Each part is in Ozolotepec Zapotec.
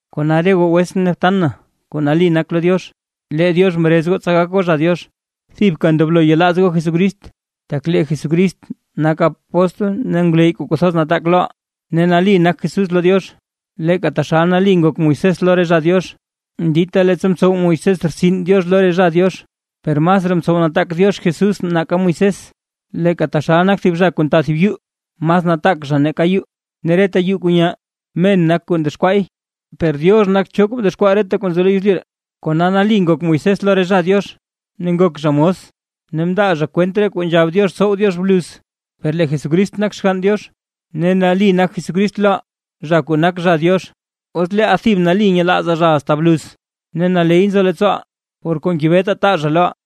Kona re goo wetsʼn ne btan na kuu nali nak lo Diox, lee Diox mrez goo tsa gak goo zha Diox, thibka ndoblo yelaaz goo Jesucrist, tak lee Jesucrist nak apóstl ne ngwleyy kuu kwathoz nataak loʼaa. Ne nali nak Jesús lo Diox, leeka taxal nali ngok Moisés lo re zha Diox, dita leettsa mtsow Moisés rtsin Diox lo re zha Diox. Per masraa mtsow nataak Diox Jesús nake Moisés, leeka taxal nak thib zha kuu nta thib yuu, mas nataak zha nake yuu. Ne reta yuu kuu nyaa, men nak kuu ndexkwaay; per Diox nak cho kuu mdexkwaa reta kwaa nzo lo yezlyu ree. Kona nali ngok Moisés lo re zha Diox, ne ngok zha mos ne mndaa zha kwent re kuu nzhab Diox tsow Diox bluz. Per lee Jesucrist nak Xgann Diox, ne nali nak Jesucrist loʼaa zha kuu nak zha Diox, os leeʼaa thib nali nyelaazaa zha asta bluz, ne naley nzo leettsooʼaa por kuu ngebetaa taa zha loʼaa.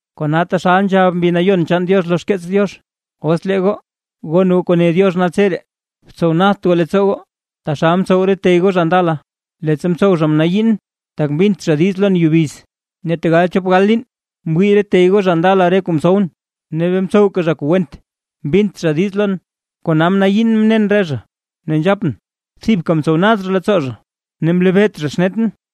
Kona taxal nzhab Mbi Nayon chaan Diox lo xkeets Diox: Os lee goo, gon goo kuu ne Diox naltseree, tsowt nadt goo leettsoo goo, taxal mtsow re tey goo zha ndala, leettsa mtsow zha mnayiin, tak mbint zha diiz lon yubiz. Ne tegal chop gal liin mwii re tey goo zha ndala re kuu mtsowʼn, ne bee mtsowka zha kuu went mbint zha diiz lon. Kona mnayiin mnen re zha, ne nzhapʼn: “Thibka mtsow nad zha leettsoo zha, ne mlebeet zha xnetʼn”.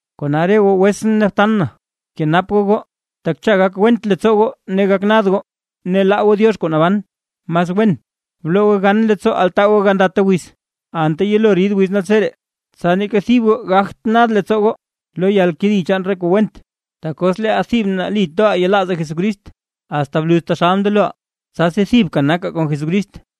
Kona re goo wetsʼn ne btan na bkenap goo goo, tak cha gak went leettsoo goo ne gak nad goo, ne laa goo Diox kuu naban. Mas wen, bloo goo gan leettsoo altaa goo gandata wiz, anta yelo rid wiz naltseree, tsa neeka thib goo gagt nad leettsoo goo lo yalkedi chaan re kuu went. Tak os leeʼaa thib nali toʼaa yelaazaa Jesucrist asta bluz taxal mndeloʼaa, tsasi thibka nakaa kon Jesucrist.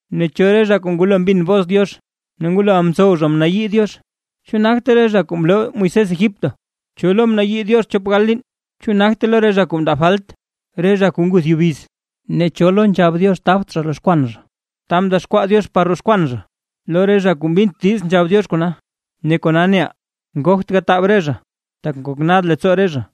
¿Ne cho re zha kuu ngwalo mbin bos Diox, ne ngwaloʼa mtsow zha mnayii Diox? ¿Chu nagte re zha kuu mloo Moisés Egipto? ¿Cho lo mnayii Diox chop gal liin? ¿Chu nagte lo re zha kuu mndaa falt, re zha kuu nguth yubiz? ¿Ne cho lo nzhab Diox tabt zha roxkwan zha, ta mdexkwaa Diox par roxkwan zha? Lo re zha kuu mbint diiz nzhab Diox kona. Ne kona neʼaa, ngogt gataab re zha, tak ngok nad leettsoo re zha.